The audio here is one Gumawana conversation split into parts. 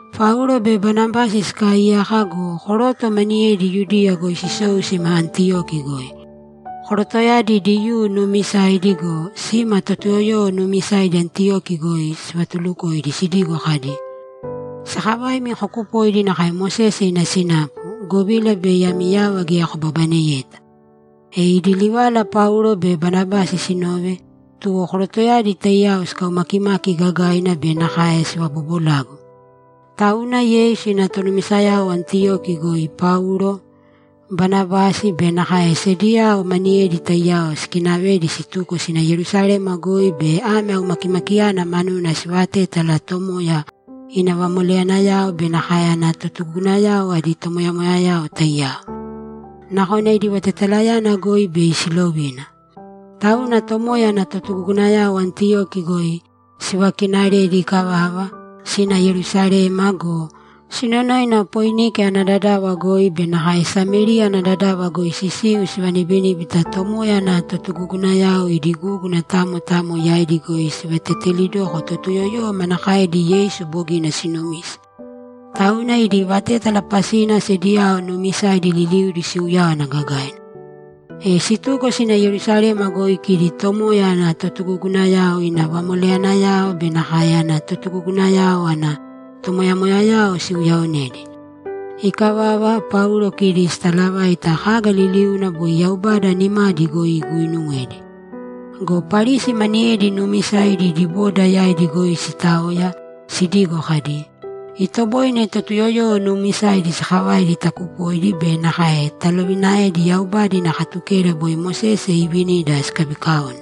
Paulo be Banabasi sikaaiyaka go, koroto maniyedi Yudiya goi sisou sima Antiyoki goi. Korotoyadi Diyuu nuumisaidi go, sima Totuyoyowo nuumisaidi Antiyoki goi sivatulukoidi sidigo kadi, ‘Sakavaimi kokupōidi nakae Mosese ina sinapu, govila bei ami yava geya kobabaneyeta.’ E idi livala Paulo be Banabasi sinove, tuwo korotoyadi taiyao sikaumakimaki gagaina be nakae sivabobolagu. Tauna Yeisu ina tonumisayao Antiyoki goi Paulo, Banabasi be nakae sediyao maniyedi taiyao sikinavedi situko sina Yerusalema goi bei ame aumakimakiyana manuna sivatétala Tomoya ina vamoleyanayao be nakae ana totugugunayao adi tomoyamoyayao taiyao. Nakona idi vatetalayana goi bei silovina. Tauna Tomoya ana totugugunayao Antiyoki goi sivakinaredi ikavava, sina Yerusalema go, sinonoina Poinike ana dadava goi be nakae Samériya ana dadava goi sisiu sivanibiníbita Tomoya ana totugugunayao idi gúguna tamo tamo yaidi goi sivatetelidoko Totuyoyowo manakaedi Yeisu bogina sinumise. Tauna idi vatétala pasina sediyao nuumisaidi liliudi siuyáwana gagaina. E situko sina Yerusalema goi kidi Tomoya ana totugugunayao, ina vamoleyanayao be nakae ana totugugunayao ana tomoyamoyayao siuyaonedi. Ikavava, Paulo kidi sitalavaita kaga liliuna boi Yaubada nimadi goi iguuinuwedi. Go Parisi maniyedi nuumisaidi idi boda yaidi goi sitaoya, sidigo kadi, ‘Itoboine Totuyoyowo nuumisaidi sakavaidi takupoidi be nakae talovinaedi Yaubada ina Katukeda boi Mosese iivinida sikabikaone.’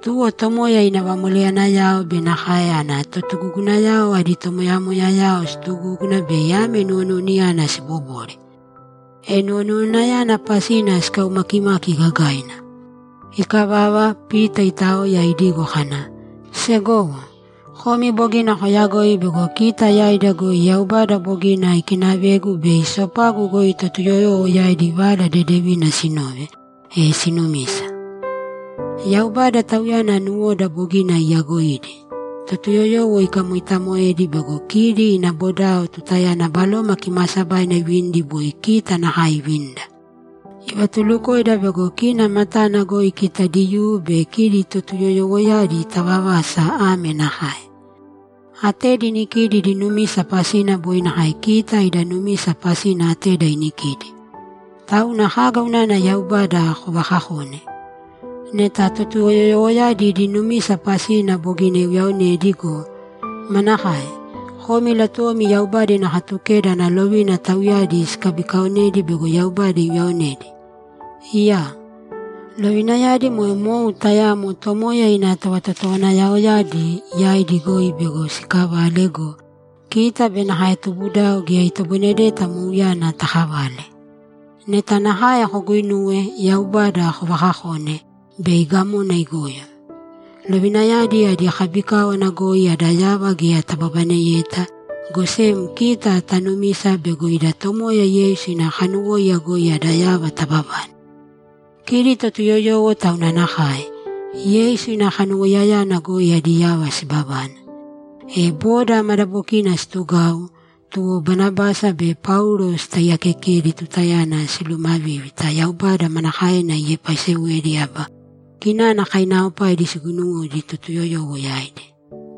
Tuwo Tomoya ina vamoleyanayao be nakae ana totugugunayao adi tomoyamoyayao situgúguna bei ame nuwonuwanayana sibobore. E nuwonuwanayana pasina sikaumakimaki gagaina. Ikavava, Pita itaoya, idigo kana, ‘Segowo, komi bogina koyagoi bego kita yaida goi Yaubada bogina ikinavegu bei sopagu goi Totuyoyowo yaidi Vala Dedevina sinove, e sinumise. Yaubada, Tauyana nuwoda bogina iyaagoidi, Totuyoyowo ikamoitamoedi bego kidi ina bodao tutayana Baloma Kimaasabaina ivinidi boi kita nakae ivinida. Ivatulukoida bego kina matana goi kita Diyuu be kidi Totuyoyowoyadi tavavasa ame nakae: Atedi inikidi idi numisa pasina boi nakae kita ida numisa pasina ateda inikidi. Tauna kaga unana Yaubada kovakakone? Neta Totuyoyowoyadi idi numisa pasina bogina iuyaonedi go, manakae? Komi latuwomi Yaubada ina Katukeda ana lovina tauyadi sikabikaonedi bego Yaubada iuyaonedi? Iyaa! Lovinayadi moe mou tayamo Tomoya ina tovatotowanayaoyadi yaidi goi bego sikavale go, kita be nakae tubudao geya itoboinedeta mouyana takavale! Neta nakae koguinuwe, Yaubada kovaakakone, bei gamona igoyo. Lovinayadi adi kabikáwana goi ada yava geya tababaneyeta, go sem kita tanumisa bego ida Tomoya Yeisu ina kanuwóiya goi ada yava tababane. Kidi Totuyoyowo tauna nakae; Yeisu ina kanuwoiyayana goi adi yava sibabane.’ E boda madabokina situgau, tuwo Banabasi be Paulo sitaiyaakekedi tutayana silumavívita Yaubada manakaena iepaisewedi aba kinana kainaaopaidi siguinuwedi Totuyoyowo yaidi.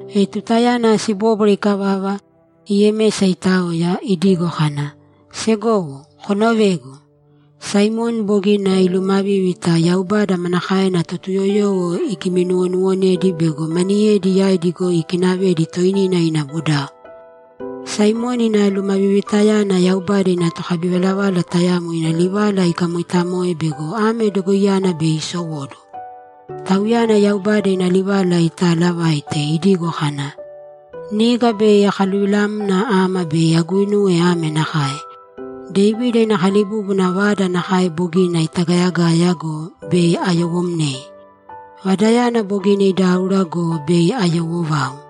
E tutayana sibóbwara ikavava, Yemesa itaoya, idigo kana, ‘Segowo, konovēgu! Saimoni bogina ilumavívita Yaubada manakaena Totuyoyowo igiminuwonuwonedi bego maniyedi yaidi goi ikinavedi toinina ina bodao. Saimoni ina lumavivitayana Yaubada ina tokabivalavala tayamo ina livala ikamoitamoe bego ame dogoiyana bei isowóduwo. Tauyana Yaubada ina livala itaalavaite, idigo kadi, “‘Niga bei akaluvilamna ama bei aguinuwe ame nakae: Devida ina kalibúbuna vada nakae bogina itagayagaya go, bei ayowomnei. Vadayana bogina idáura go, bei ayowo vau.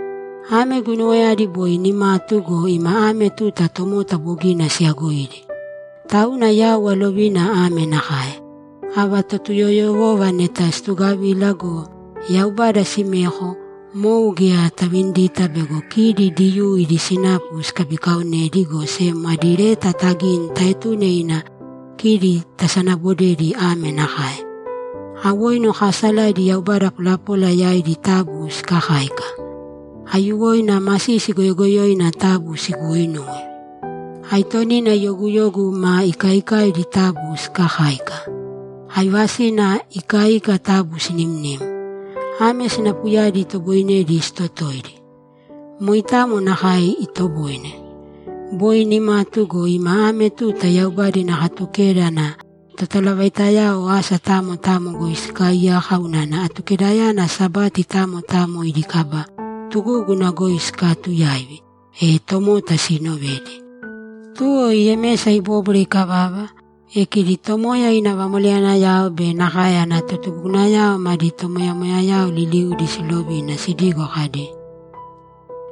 Ame guinuwayadi boi nimatu go, ima ame tuta tomota bogina siyagoidi. Tauna yau alovina ame nakae: Ava Totuyoyowova neta situgavila go, Yaubada simeko, mou geya tavinidita bego kita Diyuu ida sinapu sikabikaonedi, go sem adi leta tagīni taetūne ina kidi tasanabodedi ame nakae: Awoinu kaasalaidi yaubada polapola yaidi taabu sikakāika. Aiyuwoina masisi goyogoyoina taabu siguuinūwe. Aitonina yoguyogu ma ikaikaidi taabu sikakāika. Aivasina ikaika taabu sinimnīm. Ame sinapuyadi itoboinedi sitotoidi. Moitamo nakae itoboine. Boi nimatu go, ima ame tuta Yaubada ina Katukeda ana totalavaitayao asa tamo tamo goi sikaaiyaka unana Atukedayana Sabati tamo tamo idi kaba tugúguna goi sikaatuyaivi, e tomota siinovedi.’ Tuwo Yemesa ibóbwara ikavava, e kidi Tomoya ina vamoleyanayao be nakae ana totugugunayao madi tomoyamoyayao liliudi silovina sidigo kadi,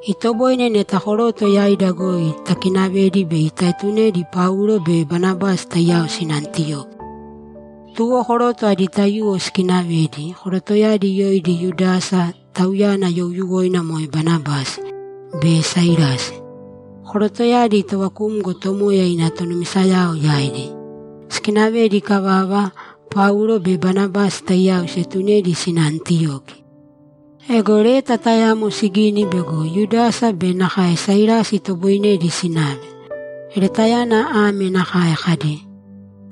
‘Itoboine neta koroto yaida goi takinavedi bei taetunedi Paulo be Banabasi taiyao sina Antiyoki.’ Tuwo koroto adi taiyuwo sikinavedi, korotoyadi yoidi Yudasa, tauyana youyuwoina moe Basabasi, be Sailasi. Korotoyadi tovakumgo Tomoya ina tonumisayao yaidi. Sikinavedi ikavava, Paulo be Banabasi taiyao sietunedi sina Antiyoki. Ego leta tayamo sigini bego Yudasa be nakae Sailasi itoboinedi sinave. Letayana ame nakae kadi,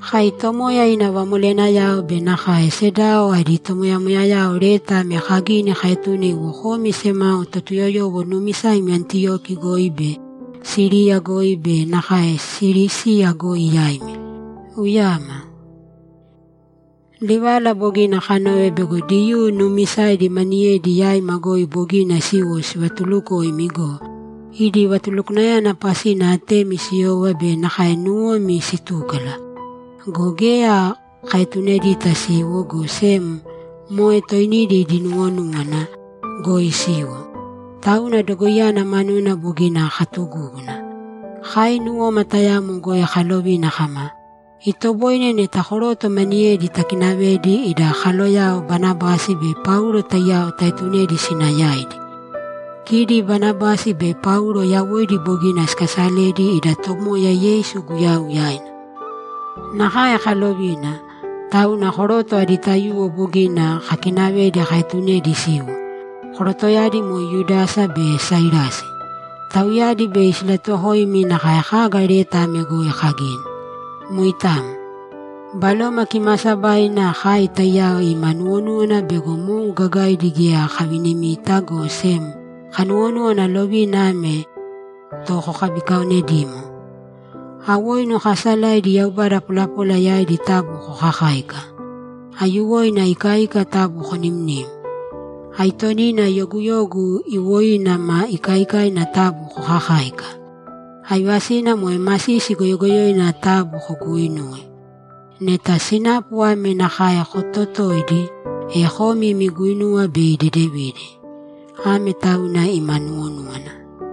‘Kai Tomoya ina vamoleyanayao be nakae sedao adi tomoyamoyayao leta ame kagini kaetune iwo komi semao Totuyoyowo nuumisaimi Antiyoki goi be Siriya goi be nakae Silisiya goi yaimi. Uyama. Livala bogina kanove bego Diyuu nuumisaidi maniyedi yaima goi bogina siwo sivatulukoimi go, idi vatulukwanayana pasina atemi siyova be nakae nuwomi sitúkala. Go geya kaetunedita siwo, go sem moe toinidi idi nuwonúwana goi siwo. Tauna dogoiyana manuna bogina katugúguna. Kai nuwoma tayamo goi kalovina kama, “Itoboine neta koroto maniyedi takinavedi ida kaloyao Banabasi be Paulo taiyao taetunedi sina yaidi.” Kidi Banabasi be Paulo yawoidi bogina sikasaledi ida Tomoya Yeisu Guyau yaina. Nakae kalovina, tauna koroto adi taiyuwo bogina kakinavedi kaetunedi siwo; korotoyadi moe Yudasa be Sailasi. Tauyadi bei silatuwokoimi nakae kaga leta ame goi kagini. Moitamo. Baloma Kimaasabaina kai taiyao ima nuwonúwana bego mou gagaidi geya kavinimita, go sem kanuwonúwana lovina ame to kokabikaonedīmo: Awoinu kaasalaidi yaubada polapola yaidi taabu kokakāika. Aiyuwoina ikaika taabu konimnīm. Aitonina yoguyogu iwoina ma ikaikaina taabu kokakāika. Aivasina moe masisi goyogoyoina taabu koguuinūwe. Neta sinapu ame nakae kototoidi, e komi imi guinuwa bei dedevina. Ame tauna ima nuwonúwana.’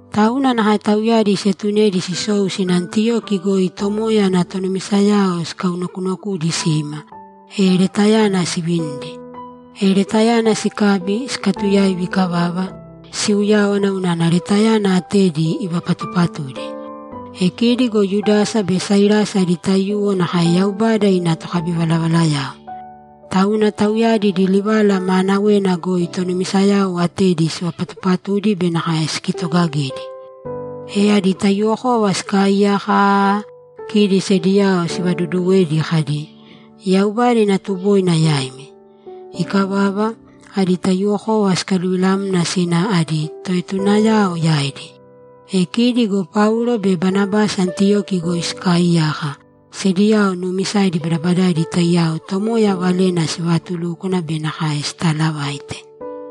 Tauna nakae tauyadi sietunedi sisou sina Antiyoki goi Tomoya ana tonumisayao sikaunokunokudi sima, e letayana sivinidi. E letayana sikabi, sikatuyaivi ikavava, siuyáwana unana letayana atedi ivapatupatudi. E kidi go Yudasa be Sailasi adi taiyuwo nakae Yaubada ina tokabivalavalayao. Tauna tauyadi idi livala maanawena goi tonumisayao atedi sivapatupatudi be nakae sikitogagedi. E adi taiyuwokova sikaaiyaka aaa, kidi sediyao sivaduduwedi kadi, ‘Yaubada ina tuboina yaimi.’ Ikavava, adi taiyuwokova sikaluvilamna sina adi toetunayao yaidi. E kidi go Paulo be Banabasi Antiyoki goi sikaaiyaka, sediyao nuumisaidi badabadaidi taiyao Tomoya Valena sivatulúkwana be nakae sitalavaite.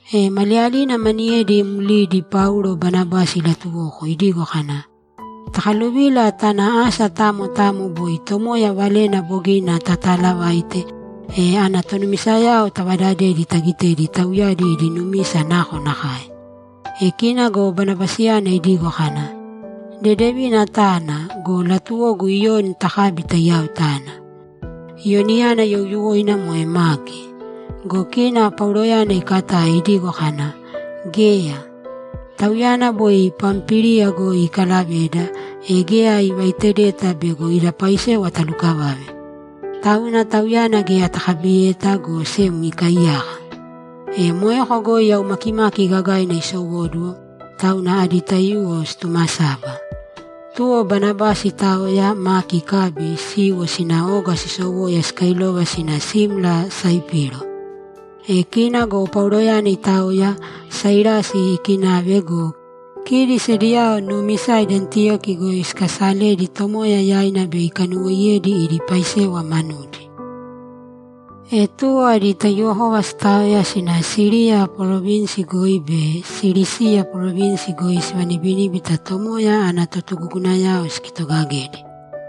E maliyalina maniyedi mlidi Paulo Banabasi ilatuwoko idigo kana, ‘Takaluvīla tāna asa tamo tamo boi Tomoya valena bogina tataalavaite, e ana tonumisayao tavadadēdi tagitēdi tauyadi idi numisa nakonakae.’ E kina go Banabasiyana idigo kana, ‘Dedevina tāna, go latuwogu Iyoni takabi taiyao tana.’ Iyoniyana youyuwoina moe Maki. Go kina Pauloyana ikatae idigo kana, ‘Geya. Tauyana boi Pampíliya goi ikalaveda, e geya ivaitedeta bego ida paisewa talukavave. Tauna tauyana geya takabiyeta, go sem ikaiyaka.’ E moeko goi aumakimaki gagaina isowóduwo, tauna adi taiyuwo situmasaba. Tuwo Banabasi itaoya, Maki ikabi, siiwo sina oga sisowoya sikailova sina simla Saipiro. E kina go Pauloyana itaoya, Sailasi ikinave go, kidi sediyao nuumisaidi Antiyoki goi sikasaledi Tomoya yaina bei ikanuwoiyedi idi paisewa manudi. E tuwo adi taiyuwokova sitaoya sina Siriya parovinsi goi be Silisiya parovinsi goi sivanibiníbita Tomoya ana totugugunayao sikitogagedi.